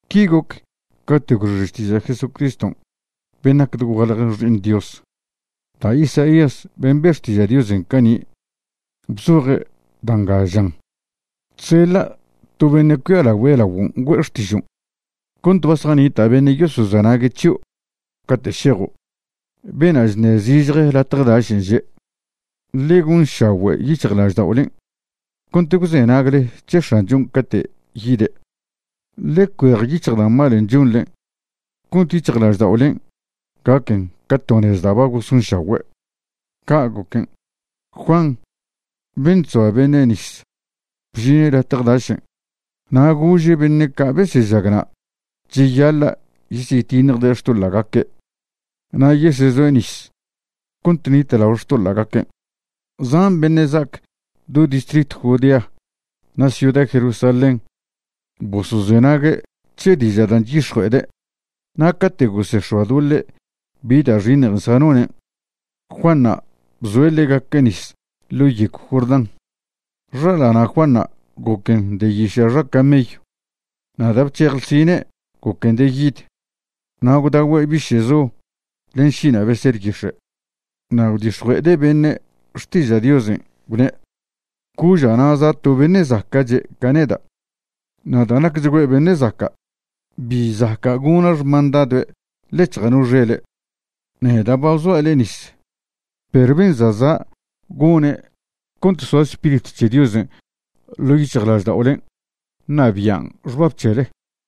Qui goc cate' gwxe xtiža' Jesucristo ben' nac dogualje Xi'iṉ Dios. Da' Isaías ben' be' xtiža' Diosen' cani' bzoje' da' nga, žan: Chseḻa' to beṉe' cuialagüe' laoguon' güe'e xtižon', cont ba zjanita' beṉe' yosozenague' c̱hio' cate' šejo'. Beṉa' chṉe' zižje latje dašen' že': “Ḻe gonšagüe' yic̱hjlažda'olen' cont gwzenagle c̱he X̱anchon' cate' yide'; ḻe cuejyic̱hj da' malen' chonḻe cont yic̱hjlažda'olen' gaquen ca to nez da' ba gosonšagüe'.” Ca' goquen', Juan ben' chzoa beṉe' nis bžine' latje dašen' na' gože' beṉe' ca' besežag na' cheyaḻa' yesyetiṉjde' xtoḻa'gaque' na' yesezoe' nis cont ṉitlao xtoḻa'gaque'. Zan beṉe' za'ac do distritw Judea na' ciuda Jerusalén bosozenague' c̱he diža' dan' chyix̱jue'ede'. Na' cate' gosex̱oadoḻe' bi da' xiṉj zjanone', Juanṉa' bzoe' ḻegaque' nis ḻo' yegw Jordán. Xaḻana' Juanṉa' goquen de yiša' xa camello na' da' bc̱hej ḻsine' goquen de yid, na' gwdagüe' biše'zo len šina' beser yix̱e'. Na' gwdix̱jue'ede' beṉe' xtiža' Diosen', gwne': ―Coža' na' za' za' to beṉe' zaca'che' ca neda', na' da' nacchgüe' beṉe' zaca', bi zaca' gona' xmandadoe' ḻec̱hja' no xele'. Neda' ba bzoa' le'e nis, perw ben' za' zan' gone' cont soa Spiritw c̱he Diosen' ḻo' yic̱hjlažda'olen' ṉabian' xbab c̱hele.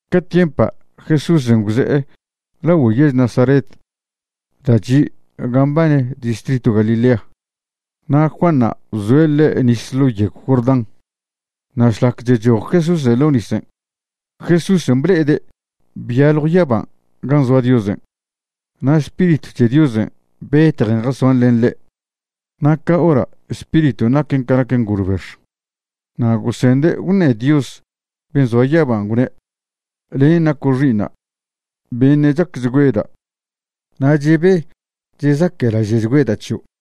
Ca tiempa' Jesúsen' gwze'e lagüe yež Nazaret da' chi' ga mbane distritw Galilea, na' Juanṉa' bzoe' ḻe' nis ḻo' yegw Jordán. Na' šlac chechoj Jesúsen' ḻo' nisen', Jesúsen' ble'ede' byaljw yaban' gan' zoa Diosen', na' Spiritw c̱he Diosen' betjen jasoan len ḻe', na' ca hora' Spiriton' naquen ca nac ngolbex. Na' gosende' gwṉe Dios ben' zoa yaba gwne': ―Len' naco' Xi'iṉa' beṉe' chacchgüeda', na' chebe chezaque'laže'chgüeda' c̱hio'.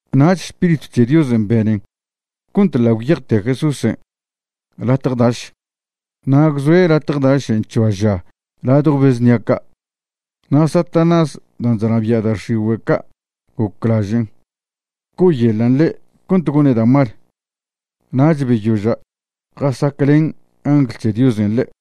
Nach Spiritw c̱he Diosen' benen cont ḻa' gwyejte Jesúsen' latje daš. Na' gwzoe' latje dašen' c̱hoa ža ladjo be znia ca'. Na' Satanás dan' chnabia' da' xigüe' ca' goclažen' co'oyeḻan' ḻe' cont gone' da' mal. Nach beyoža' jasaclen angl c̱he Diosen' ḻe'.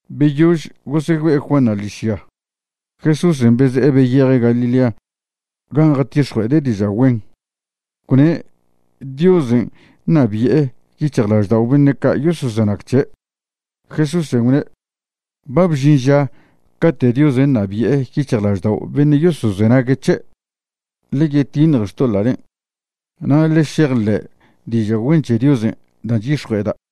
Beyož gosegüe'e Juanṉa' ḻižya, Jesúsen' beze'e beyeje' Galilea gan' jatix̱jue'ede' diža' güen, gwne' Diosen' ṉabi'e yic̱hjlaždao' beṉe' ca' yosozenag c̱he'. Jesúsen' gwne': ―Ba bžin ža cate' Diosen' ṉabi'e yic̱hjlaždao' beṉe' yosozenagüe' c̱he'. Ḻe yetiṉje xtoḻa'len' na' ḻe šejḻe' diža' güen c̱he Diosen' da' chyix̱jue'eda'.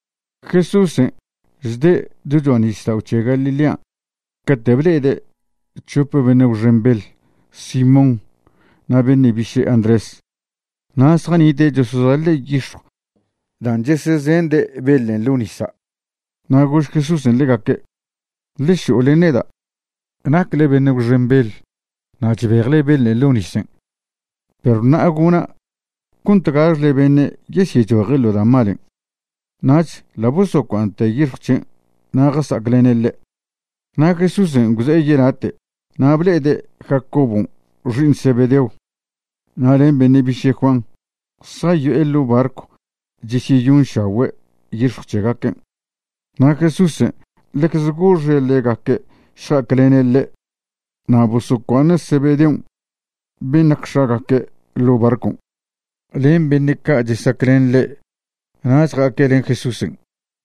Jesúsen' chde' do cho'a nisdao' c̱he Galilean' cate' ble'ede' c̱hope beṉe' gwxen beḻ, Simón na' beṉe' biše' Andrés. Na' zjanite' chosozaḻe' yix̱jw dan' chesezende' beḻen' ḻo' nisa'. Na' gož Jesúsen' ḻegaque': ―Ḻe šo'o len neda'. Nacle beṉe' gwxen beḻ na' chbejle beḻen' ḻo' nisen', perw ṉa'a gona' cont gaxle beṉe' yesyechoje' ḻo da' malen'. Nach ḻa' bosocua'aṉte yix̱jw c̱hen' na' jasa'aclene' ḻe'. Na' Jesúsen' gwze'e yelate' na' ble'ede' Jacobon' xi'iṉ Zebedeo na' len beṉe' biše' Juan, zjayo'e ḻo' barcw chesyeyonšagüe' yix̱jw c̱hegaquen'. Na' Jesúsen' ḻecze goxe' ḻegaque' šja'aclene' ḻe' na' bosocua'aṉe' Zebedeon' ben' nac x̱agaque ḻo' barcon' len beṉe' ca' chesaclen ḻe', nach ja'aque' len Jesúsen'.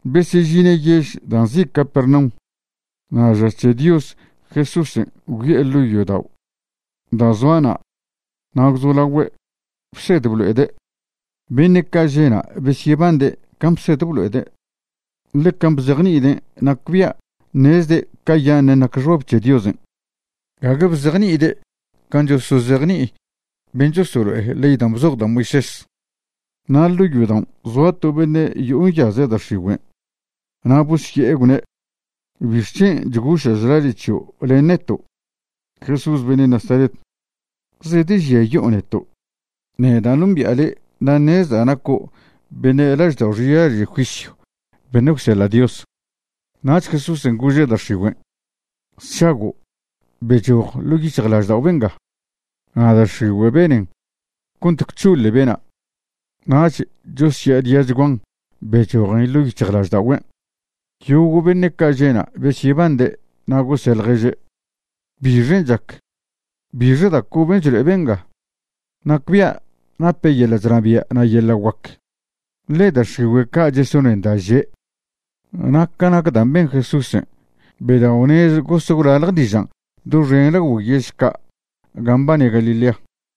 Besežine' yež da' nzi' Capernaum, na' ža c̱he Dios Jesúsen' gwyo'e ḻo' yodao' da' zoa na' na' gwzolagüe' bsed blo'ede'. Beṉe' ca' že' na' besyebande' can' bsed blo'ede', ḻe can' bzejni'iden' nacbia' ṉezde' cayaṉen' nac xbab c̱he Diosen', gague bzejni'ide' can' chosozejni'i ben' chosolo'e ley dan' bzoj da' Moisés. Na' ḻo' yodaon' zoa to beṉe' yo'o nyaze' da' x̱igüen', na' bosye'e gwne': ―¿Bixc̱hen' chgoša' chlaže' c̱hio' len neto', Jesús beṉe' Nazaret? ¿Zedežiayo'o neto'? Neda' nombi'a le' na' ṉezda' naco' beṉe' laždao' xilaže' juisyw beṉe' gwseḻa' Dios. Nach Jesúsen' gože' da' x̱igüen': ―¡Sšago', bechoj ḻo' yic̱hjlaždao' benga! Na' da' x̱igüen' benen cont gwc̱hoḻe bena', nach chosya'adiachguan bechojen ḻo' yic̱hjlažda'ogüen'. Yogo' beṉe' ca' že' na' besyebande' na' gose' ḻježe': ―¿Bixen' chac? ¿Bixe da' coben' chlo'e benga? ¡Nacbia' nape' yeḻa' chnabia' na' yeḻa' guac, ḻe da' x̱igüe' ca' chesonen da' že'! Na' ca nac dan' ben Jesúsen' bedao'nez gos gwlalje dižan' doxen lagüe yež ca' gan' mbane Galilea.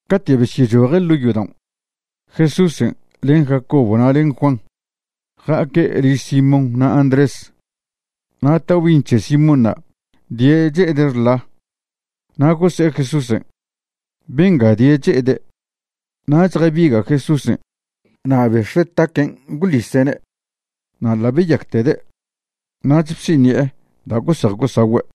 Cate' besyechoje' ḻo' yodaon', Jesúsen' len Jacobo na' len Juan ja'aque' liž Simón na' Andrés. Na' taobi'iṉ c̱he Simónṉa' die' che'ede' xḻa; na' gose'e Jesúsen': ―Benga die' che'ede'. Nach jabiga' Jesúsen' na' bex̱ue' taquen' gwḻise'ne'. Na' ḻa' beyactede', nach bsiṉi'e da' gose'ej gosagüe'.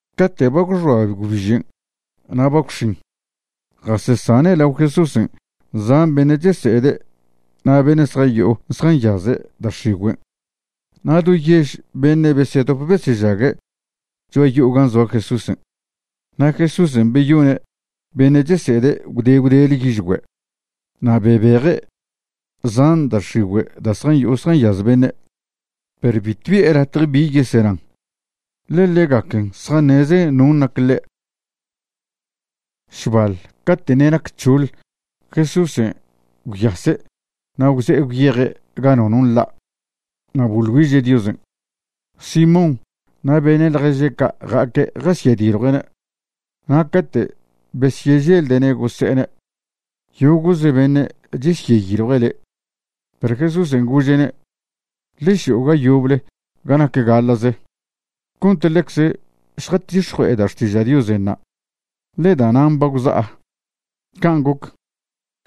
Cate' ba gwxoa gwbižen' na' ba gwx̱in, jasesane' lao Jesúsen' zan beṉe' chese'ede' na' beṉe' zjayo'o zjanyaze' da' x̱igüen'. Na' do yež beṉe' besedop besežague' cho'a yo'o gan' zoa Jesúsen'. Na' Jesúsen' beyone' beṉe' chese'ede' gwde gwdele yižgüe' na' bebeje' zan da' x̱igüe' da' zjayo'o zjanyaz beṉe', perw bitw bi'e latje bi yesenan, ḻe ḻegaquen zjaṉezen non' nac ḻe'. Šbaḻ cate' ṉe' nac c̱hoḻjesúsen' gwyase' na' gwze'e gwyeje' ga nono nḻa' na' boḻ güiže' Diosen'. Simón na' beṉe' ḻježe' ca' ja'aque' jasyediljue'ne'. Na' cate' besyeželde'ne' gose'ene': ―Yogo'ze beṉe' chesyeyiljue' le'. Perw Jesúsen' gože'ne': ―Ḻe šo'o ga yoble ga nac gaḻa'ze cont ḻecze šjatix̱jue'eda' xtiža' Diosen' na', ḻe da'nan' ba gwza'a. Can' goc,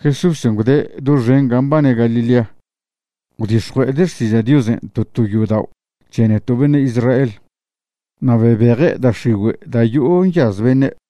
Jesúsen' gwde' doxen gan' mbane Galilea gwdix̱jue'ede' xtiža' Diosen' to to yodao' c̱he neto' beṉe' Israel, na' bebeje' da' x̱igüe' da' yo'o nyaz beṉe'.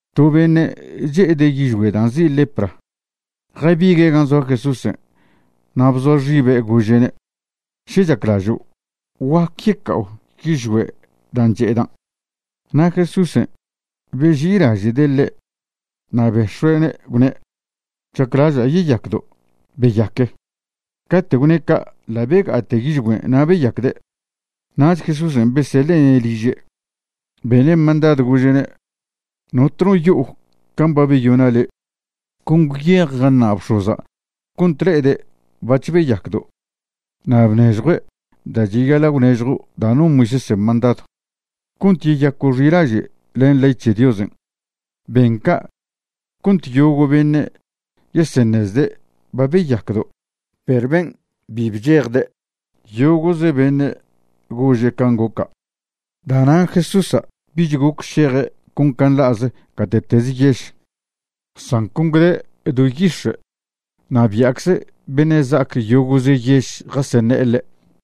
To beṉe' che'ede' yižgüe' dan' nzi' lepra jabigue' gan' zoa Jesúsen' na' bzoa xibe' gože'ne': ―Še chaclažo', guac yeca'o yižgüe' dan' che'edan'. Na' Jesúsen' beži'ilaže'de' ḻe' na' bex̱ue'ne' gwne': ―Chaclaža' yeyacdo'. Beyaque. Cate' gwne' ca' ḻa' bega'ate yižgüen' na' beyacde'. Nach Jesúsen' beseḻe'ne' liže', bene' mandadw, gože'ne': ―Notno yo'o can' ba beyona' le', con gwyej jaṉa' bx̱oza' cont le'ede' bac̱h beyacdo', na' bnežjw da' cheyaḻa' gwnežjo' dan' non Moisésen' mandadw cont yeyaco' xilaže' len ley c̱he Diosen'. Ben ca' cont yogo' beṉe' yeseṉezde' ba beyacdo'. Perw ben' bi bchejde', yogo'ze beṉe' gože' can' goca'. Da'nan' Jesúsa' bich goc šeje' con ca nḻa'ze gate'teze yež, san con gwde' do yix̱e', na' bia'cze beṉe' za'ac yogo'ze yež jaseṉe'e ḻe'.